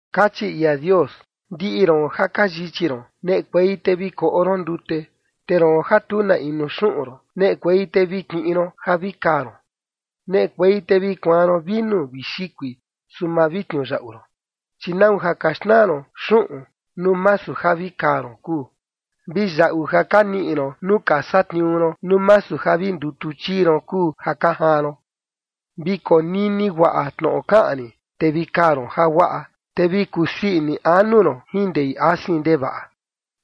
Kachi ia Dios: “Ndiꞌi ron ja ka yichi ron, neꞌekuei te vi koꞌo ron ndute. Te roon ja tu na inu xuꞌun ron, neꞌekuei te vi kiꞌin ron ja vi kaa ron. Neꞌekuei te vi kuaan ron vinu vi xikui, su ma vi tniuyaꞌu ron. ¿Chi nau ja ka xnaa ron xuꞌun nuu masu ja vi kaa ron kuu, vi yaꞌu ja ka niꞌi ron nuu ka satniuu ron nuu masu ja vi ndutu chii ron kuu ja ka jaan ron? Vi konini guaꞌa tnoꞌo kaꞌan rin, te vi kaa ron jaguaꞌa, te vi kusii ini anu ron jin ndei asin ndevaꞌa.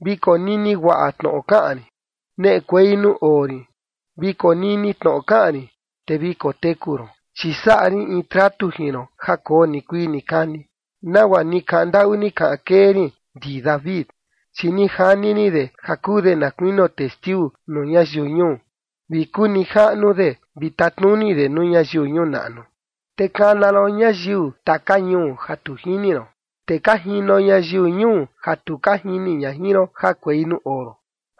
Vi konini guaꞌa tnoꞌo kaꞌan rin: Neꞌekuei nuu oo rin. Vi konini tnoꞌo kaꞌan rin, te vi koteku ron. Chi saꞌa rin in tratu jin ron ja koo nikuii nikani, nagua ni kaꞌan ndaꞌu ni kaꞌan kee rin ndi David. Chi ni jani rin de ja kuu de na kuinio testiu nuu ñayiu ñuu, vi kuu nijaꞌnu de vi tatnuni de nuu ñayiu ñuu naꞌnu. Te kana ron ñayiu taka ñuu ja tu jini ron, te ka jino ñayiu ñuu ja tu ka jini ña jin ron jakuei nuu oo ron,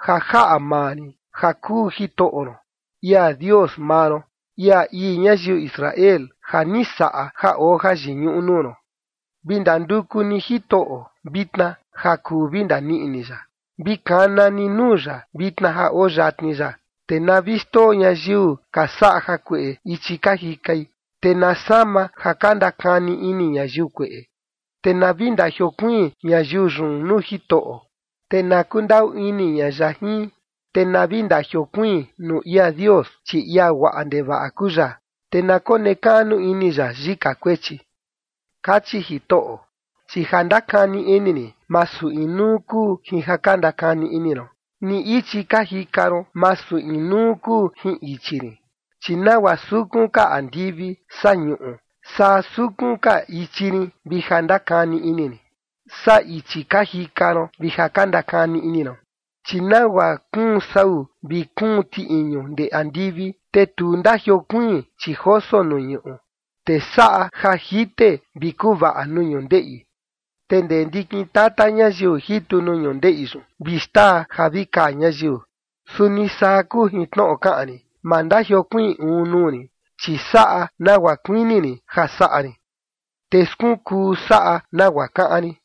ja jaꞌa maa rin ja kuu Jitoꞌo ron, ia Dios maa ron, ia ii ñayiu Israel ja ni saꞌa ja oo jayiñuꞌu nuu ron.” Vi ndanduku ni Jitoꞌo vitna ja kuu vi ndaniꞌi ni ya. Vi kana ni nuu ya vitna ja oo yatni ya. Te na vi xndoo ñayiu ka saꞌa jakueꞌe ichi ka jikai, te na sama ja ka ndakani ini ñayiu kueꞌe, te na vi ndajiokuiin ñayiu yun nuu Jitoꞌo, te na kundaꞌu ini ña ya jin. Te na vi ndajiokuiin nuu ia Dios, chi ia guaꞌa ndevaꞌa kuu ya, te na konekaꞌnu ini ya yika kuechi. Kachi Jitoꞌo: “Chi ja ndakani ini rin, masu inuu kuu jin ja ka ndakani ini ron, ni ichi ka jika ron, masu inuu kuu jin ichi rin. Chi nagua sukun ka andivi saa ñuꞌu, saa sukun ka ichi rin vi ja ndakani ini rin saa ichi ka jika ron vi ja ka ndakani ini ron. Chi nagua kuun sau vi kuun ti iñu ndee andivi, te tu ndajiokuiin, chi joso nuu ñuꞌu, te saꞌa ja jite vi kuvaꞌa nuu ñundeꞌi, te ndee ndikin tata ñayiu jitu nuu ñundeꞌi yun vi xtaa ja vi kaa ñayiu, suni saa kuu jin tnoꞌo kaꞌan rin. Ma ndajiokuiin uun nuu rin, chi saꞌa nagua kuini rin ja saꞌa rin, te skunkuu saꞌa nagua kaꞌan rin.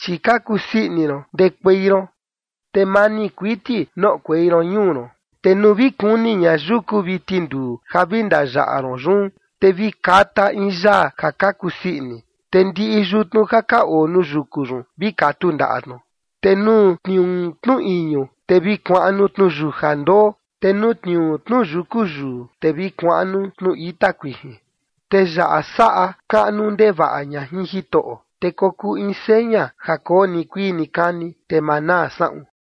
Chi ka kusii ini ron ndekuei ron te mani kuiti noꞌokuei ron ñuu ron, te nuu vi kuni ña yuku vi tinduu ja vi ndayaꞌa ron yun, te vi kata in yaa ja ka kusii ini, te ndiꞌi yutnu ja ka oo nuu yuku yun vi katu ndaꞌa tnu. Te nuu tniuu tnu iñu, te vi kuaꞌnu tnuyuja ndoo, te nuu tniuu tnu yuku yuu, te vi kuaꞌnu tnu ita kuijin, te yaꞌa saꞌa kaꞌnu ndevaꞌa ña jin Jitoꞌo, te kokuu in seña ja koo nikuii nikani, te ma naa saꞌun.”